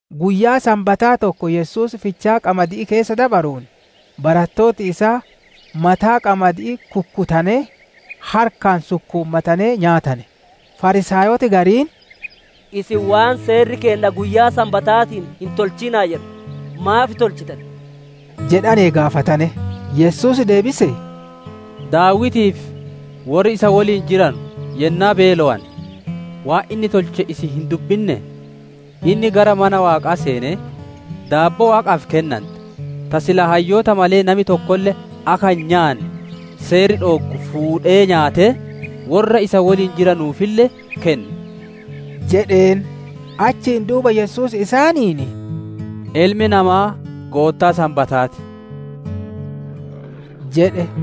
Guyyaa Sanbataa tokko Yesuus fichaa qamadi'ii keessa dabaruun, barattooti isaa mataa qamadi'ii kukkutanee, harkaan sukkuumatanee, nyaatane. Fariisaayoti gariin, «Isin waan Seerri keenna guyyaa Sanbataatiin hin tolchina'a jedhu, maaf tolchitan?» jedhanee gaafatane. Yesuus deebisee, «Daawitii fi worri isa woliin jiranu yennaa beelowane, waan inni tolche isin hin dubbinnee? Inni gara mana Waaqaa seenee, daabboo Waaqa dura dhikaattu, ta silaa hayyoota malee nami tokkolle akka hin nyaanne Seerri dhooggu fuudhee nyaatee, worra isa woliin jiranuufille kenne» jedheen. Achiin duuba Yesuus isaaniin, «Ilmi Namaa Goottaa Sanbataa ti» jedhe.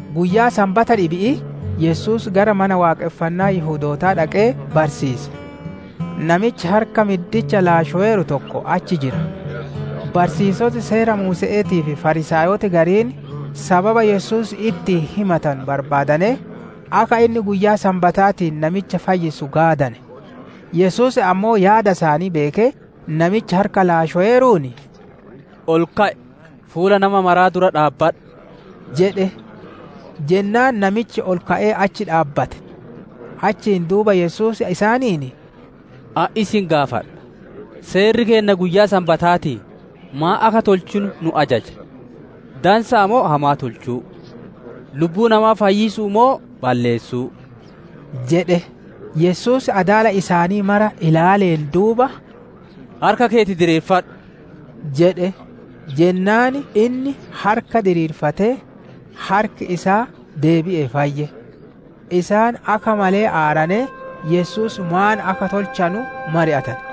Guyyaa Sanbata dhibi'ii Yesuus gara Mana Waaqonfannaa Yihudootaa dhaqee barsiise. Namichi harka middicha laashoweeru tokko achi jira. Barsiisoti Seera Muuse'eetii fi Fariisaayoti gariin sababa Yesuus ittiin himatanu barbaadanee, akka inni guyyaa Sanbataatiin namicha fayyisu gaadane. Yesuus ammoo yaada isaanii beekee namicha harka laashoweeruun, «Ol ka'i, fuula nama maraa dura dhaabbadhu!» jedhe. Jennaan namichi ol ka'ee achi dhaabbate. Achiin duuba Yesuus isaaniin, «Ani isin gaafadha: Seerri keenna guyyaa Sanbataatiin maan akka tolchinu nu ajaja? Dansaa moo hamaa tolchuu? Lubbuu namaa fayyisuu moo balleessuu?» jedhe. Yesuus adaala isaanii mara ilaaleen duuba, «Namichaan harka keeti diriirfadhu» jedhe. Jennaan, inni harka diriirfatee, harki isaa deebi'ee fayye. Isaan akka malee aaranee Yesuus maan akka tolchanu mari'atane.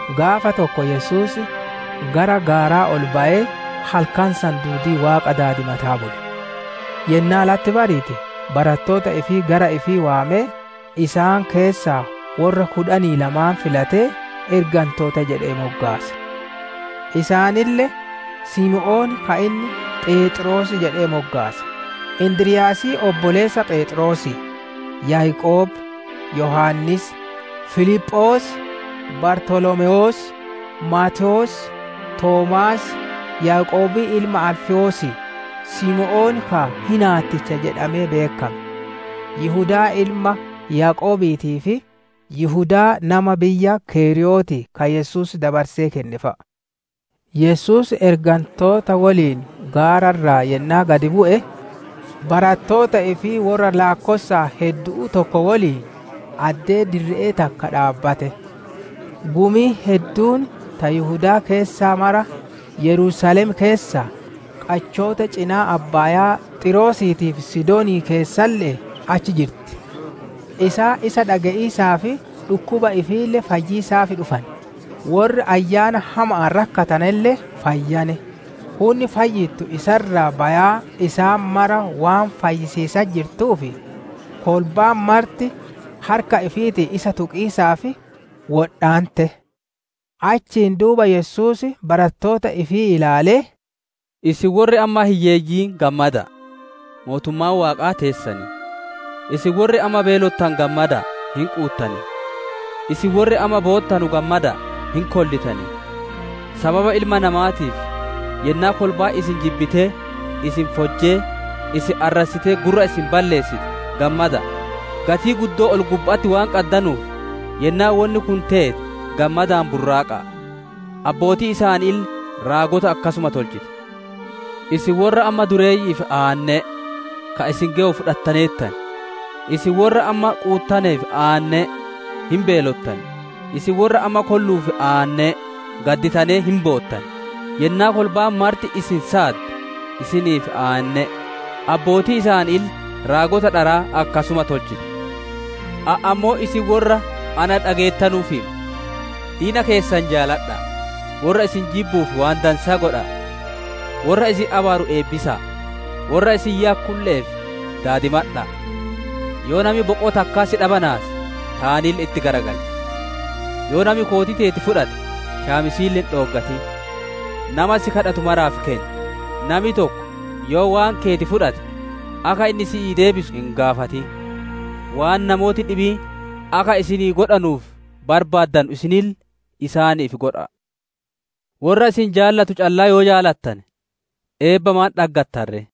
Gaafa tokko Yesuus gara gaaraa ol bayee halkan san duudii Waaqa daadimataa bule. Yennaa latti bariite barattoota ifii gara ifii waamee, isaan keessaa worra kudhanii lamaan filatee, «Ergantoota» jedhee moggaase. Isaanille, Simoon ka inni Pheexroos jedhee moggaase, Indiryaasii obboleessa Pheexroosii, Yaaqoob, Yohaannis, Filiphoos, Bartolomewoos, Maatewoos, Toomaas, Yaaqoobii ilma Alfewoosii, Simoon ka, «Hinaatticha» jedhamee beekkame, Yihudaa ilma Yaaqoobiitii fi Yihudaa nama biyya keriyootii, ka Yesuus dabarsee kenne fa'a. Yesuus ergantoota woliin gaara irraa yennaa gad bu'e, barattoota ifii worra laakkossaan heddu'uu tokko woliin addee dirree takka dhaabbate. Gumiin hedduun ta Yihudaa keessaa mara, Yerusaalem keessaa, qachoota cinaa abbaayaa Xiiroosiitii fi Sidoon keessalle'ee achi jirti; isaan isa dhage'iisaa fi dhukkuba ifiille fayyiisaaf dhufane. Worri ayyaana hama'aan rakkatanelle fayyane. Hunni fayyittu isa irraa bayaa isaan mara waan fayyisiisatti jirtuuf, kolbaan marti harka ifiitiin isa tuqiisaaf wodhaante. Ahiin duuba Yesuus barattoota ifii ilaalee, «Isin worri amma hiyyeeyyiin gammada'a; mootummaan Waaqaa teessan! Isin worri amma beelottanu gammada'a; hin quuttan! Isin worri amma boottanu gammada'a; hin kollitan! «Sababa Ilma Namaatiif, yennaa kolbaan isin jibbitee, isin fojjee, isin arrassitee gurra isin balleessite, gammada'a! Gatii guddoo ol-gubba'atti waan qaddanuuf yennaa wonni kun teete gammadaan burraaqa'a. Abbootiin isaaniille raagota akkasuma tolchite. «Isin worra amma dureeyyi'iif aanne'e; ka isin gewu fudhattaneertan! Isin worra amma quuttaneef aanne'e; hin beelottan! Isin worra amma kolluuf aanne'e; gadditanee hin boottan! «Yennaa kolbaan marti isin saadde isiniif aanne'e; abbootiin isaaniille raagota dharaa akkasuma tolchite. «Ani ammoo isin worra na dhageettanuuf hima: Diina keessan jaaladha'a, worra isin jibbuuf waan dansaa godha'a. Worra isin abaaru eebbisa'a, worra isin yakkulle'eef daadimadha'a! Yoo nami boqoo takkaa si dhabanaase, taanille itti garagalchi; yoo nami kootii teeti fudhate, shaamisiille hin dhooggatin! Nama si kadhatu maraaf kenni, nami tokko yoo waan keeti fudhate, akka inni si'iif deebisu hin gaafatin. Waan namooti dhibiin akka isinii godhanuuf barbaaddanu isinille isaaniif godha'a. «Worra isin jaalatu callaa yoo jaalattane, eebba maan dhaggattan ree?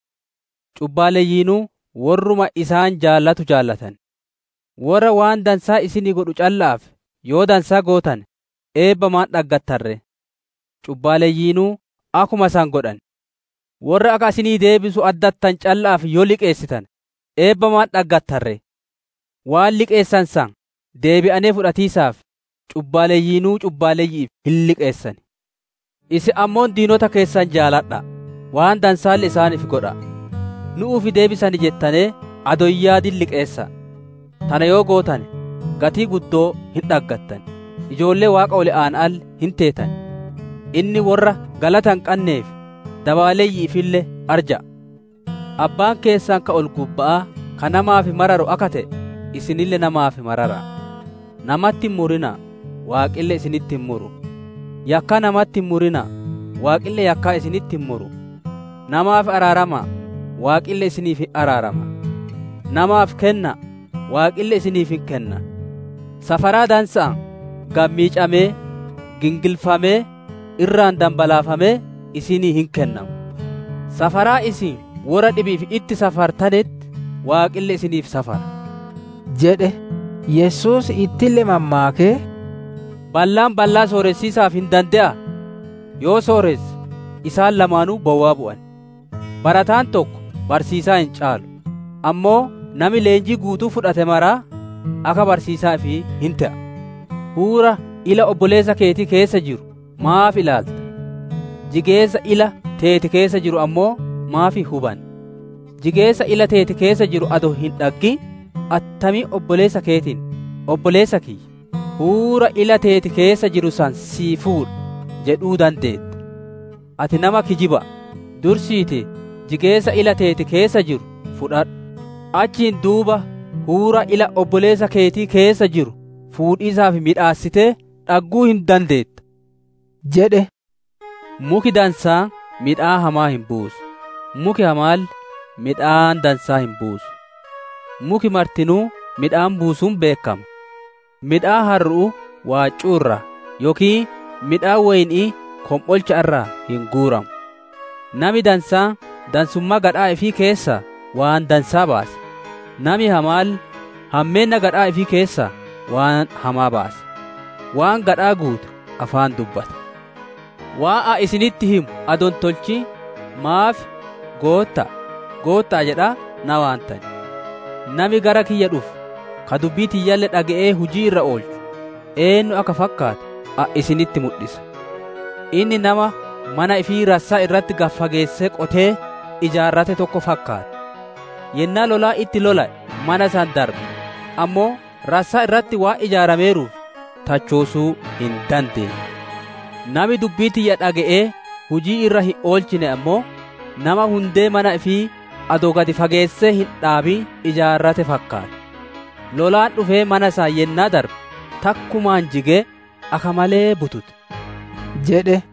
Cubbaaleyyiinuu worruma isaan jaalatu jaalatan. Worra waan dansaa isinii godhu calla'aaf yoo dansaa gootane, eebba maan dhaggattan ree? Cubbaaleyyiinuu akkuma san godhan. Worra akka isinii deebisu addattanu calla'aaf yoo liqeessitane, eebba maan dhaggatan ree? Waan liqeessane san deebi'anee fudhatiisaaf, cubbaaleyyiinuu cubbaaleyyi'iif hin liqeessan. Isin ammoo diinota keessan jaaladha'a, waan dansaalle isaaniif godha'a. Nu'uuf deebisan jettanee adoo hin yaadin liqeessa'a. Tana yoo gootane gatii guddoo hin dhaggattan, ijoollee Waaqa Ol Aana'aalle hin teetan. Inni worra galata hin qannee fi dabaaleyyi'iifille arja'a. Abbaan keessan ka ol-gubba'aa ka namaaf mararu akka te'e, isinille namaaf marara'a. «Namatti hin murina'a, Waaqille isinitti hin muru; yakkaa namatti hin murina'a, Waaqille yakkaa isinitti hin muru; namaaf araarama'a, Waaqille isiniif hin araarama. Namaaf kenna'a, Waaqille isiniif hin kenna. Safaraa dansa'aan, gad miicamee, gingilfamee, irraan danbalaafamee isinii hin kennama. Safaraa isin worra dhibi'iif itti safartanetti Waaqille isiniif safara» jedhe. Yesuus ittille mammaakee, «Ballaan ballaa sooressiisaaf hin dande'a? Yoo sooresse, isaan lamaanuu bowwaa bu'an. Barataan tokko barsiisaa hin caalu; ammoo nami leenjii guutuu fudhate maraa, akka barsiisaa ifii hin te'a. «Huura ila obboleessa keetii keessa jiru maaf ilaalta? Jigeessa ila teeti keessa jiru ammoo maaf hin hubanne? Jigeessa ila teeti keessa jiruu adoo hin dhaggin, attamiin obboleessa keetiin, ‹Obboleessa kiyya, huura ila teeti keessa jiru san sii fuudha› jedhuu dandeetta? Ati nama kijiba'a! Dursiitii jigeessa ila teeti keessa jiru fudhadhu, achiin duuba huura ila obboleessa keetii keessa jiru fuudhiisaaf miidhassitee dhagguu hin dandeetta» jedhe. «Muki dansaan midhaan hamaa hin buusu, muki hamaalle midhaan dansaa hin buusu. Muki martinuu midhaan buusuun beekkama; midhaan harru'uu waaccuu irraa yookiin midhaan woyni'ii kom'olcha irraa hin guuranu. Nami dansaan dansummaa gadhaa ifii keessaa waan dansaa baasa; nami hamaalle hammeenna gadhaa ifii keessaa waan hamaa baasa. Waan gadhaa guute afaan dubbata. «Waan Ani isinitti himu adoo hin tolchin, maaf, ‹Goottaa, Goottaa› jedhaa na waantan. Nami gara kiyya dhufu, ka dubbii tiyyalle dhage'ee hujii irra oolchu, eennu akka fakkaatu Ani isinitti mudhisa. Inni nama mana ifii rassaa irratti gad fageessee qotee ijaarrate tokko fakkaata. Yennaa lolaan itti lola'ee mana san darbe ammoo rassaa irratti waan ijaarameeruuf, tachoosuu hin dandeenne. Nami dubbii tiyya dhage'ee hujii irra hin oolchine ammoo, nama hundee mana ifii adoo gad fageessee hin dhaabin ijaarrate fakkaata. Lolaan dhufee mana san yennaa darbe, takkumaan jigee, akka malee butute» jedhe.